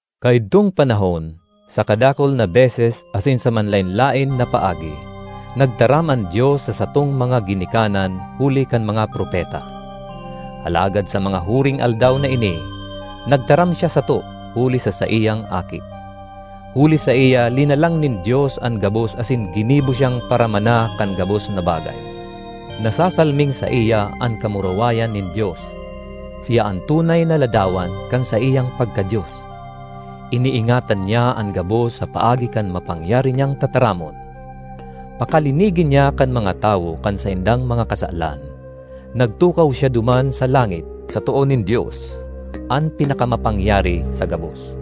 Kaidtong panahon, sa kadakul na beses asin sa manlaen-laen na paagi, nagtaram an Dios sa satong mga ginikanan huli kan mga propeta. Alagad sa mga huring aldaw na ini nagtaram siya sato huli sa saiyang Aki. Huli saiya linalang nin Dios an gabos asin ginibo siyang paramana kan gabos na bagay. Nasasalming saiya an kamurawayan nin Dios; siya an tunay na ladawan kan saiyang pagka-Dios. Iniingatan niya an gabos sa paagi kan mapangyari niyang tataramon. Pakalinigi niya kan mga tawo kan saindang mga kasalan, nagtukaw siya duman sa langit sa too nin Dios, an Pinakamapangyari sa gabos.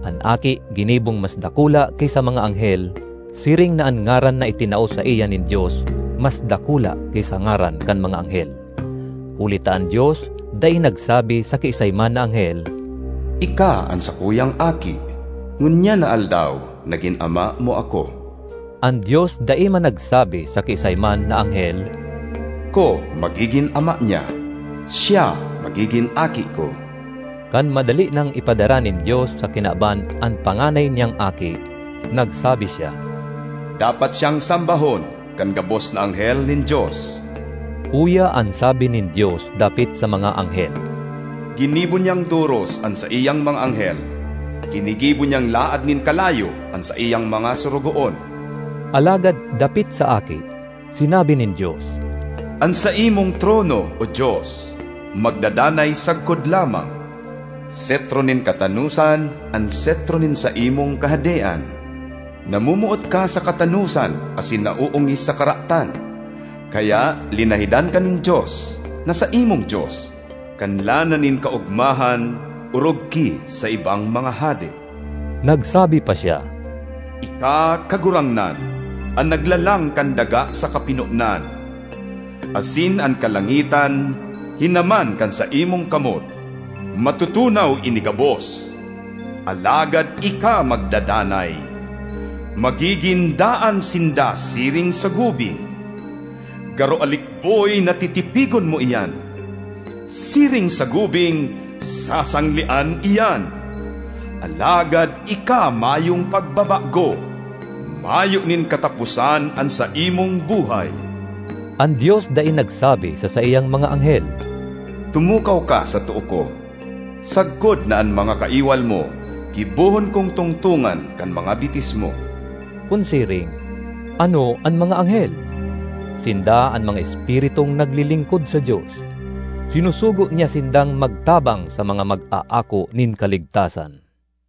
An Aki ginibong mas dakula ki sa mga anghel siring na an ngaran na itinao saiya nin Dios mas dakula ki sa ngaran kan mga anghel. Huli ta an Dios dai nagsabi sa kiisay man na anghel, “Ika an sakuyang Aki, ngunyan na aldaw nagin Ama mo ako.” An Dios dai man nagsabi sa kiisay man na anghel, “Ako magigin Ama niya, siya magigin Aki ko.” Kan madali nang ipadara nin Dios sa kinaban an panganay niyang Aki, nagsabi siya, “Dapat siyang sambahon kan gabos na anghel nin Dios.” Uya an sabi nin Dios dapit sa mga anghel, “Ginibo niyang doros an saiyang mga anghel; ginigibo niyang laad nin kalayo an saiyang mga sorogoon.” Alagad dapit sa Aki, sinabi nin Dios: “An saimong trono, O Dios, magdadanay sagkod lamang! Setro nin katanosan an setro nin saimong kahadean. Namomoot ka sa katanosan asin naoongis sa karatan; kaya linahidan ka nin Dios, na saimong Dios, kan lana nin kaogmahan orog ki sa ibang mga hade.” Nagsabi pa siya: “Ika, Kagurangnan, an naglalang kan daga sa kapinonan; asin an kalangitan hinaman kan saimong kamot. Matutunaw ini gabos, alagad ika magdadanay; magigin daan sinda siring sa gubing; garo alikboy na titipigon mo iyan; siring sa gubing, sasanglean iyan. Alagad ika mayong pagbabago, mayo nin kataposan an saimong buhay.” An Dios dai nagsabi sa saiyang mga anghel: “Tumukaw ka sa too ko, sagkod na an mga kaiwal mo gibohon kong tungtongan kan mga bitis mo.” Kun siring, ano an mga anghel? Sinda an mga espiritung naglilingkod sa Dios; sinusugo niya sindang magtabang sa mga mag-aako nin kaligtasan.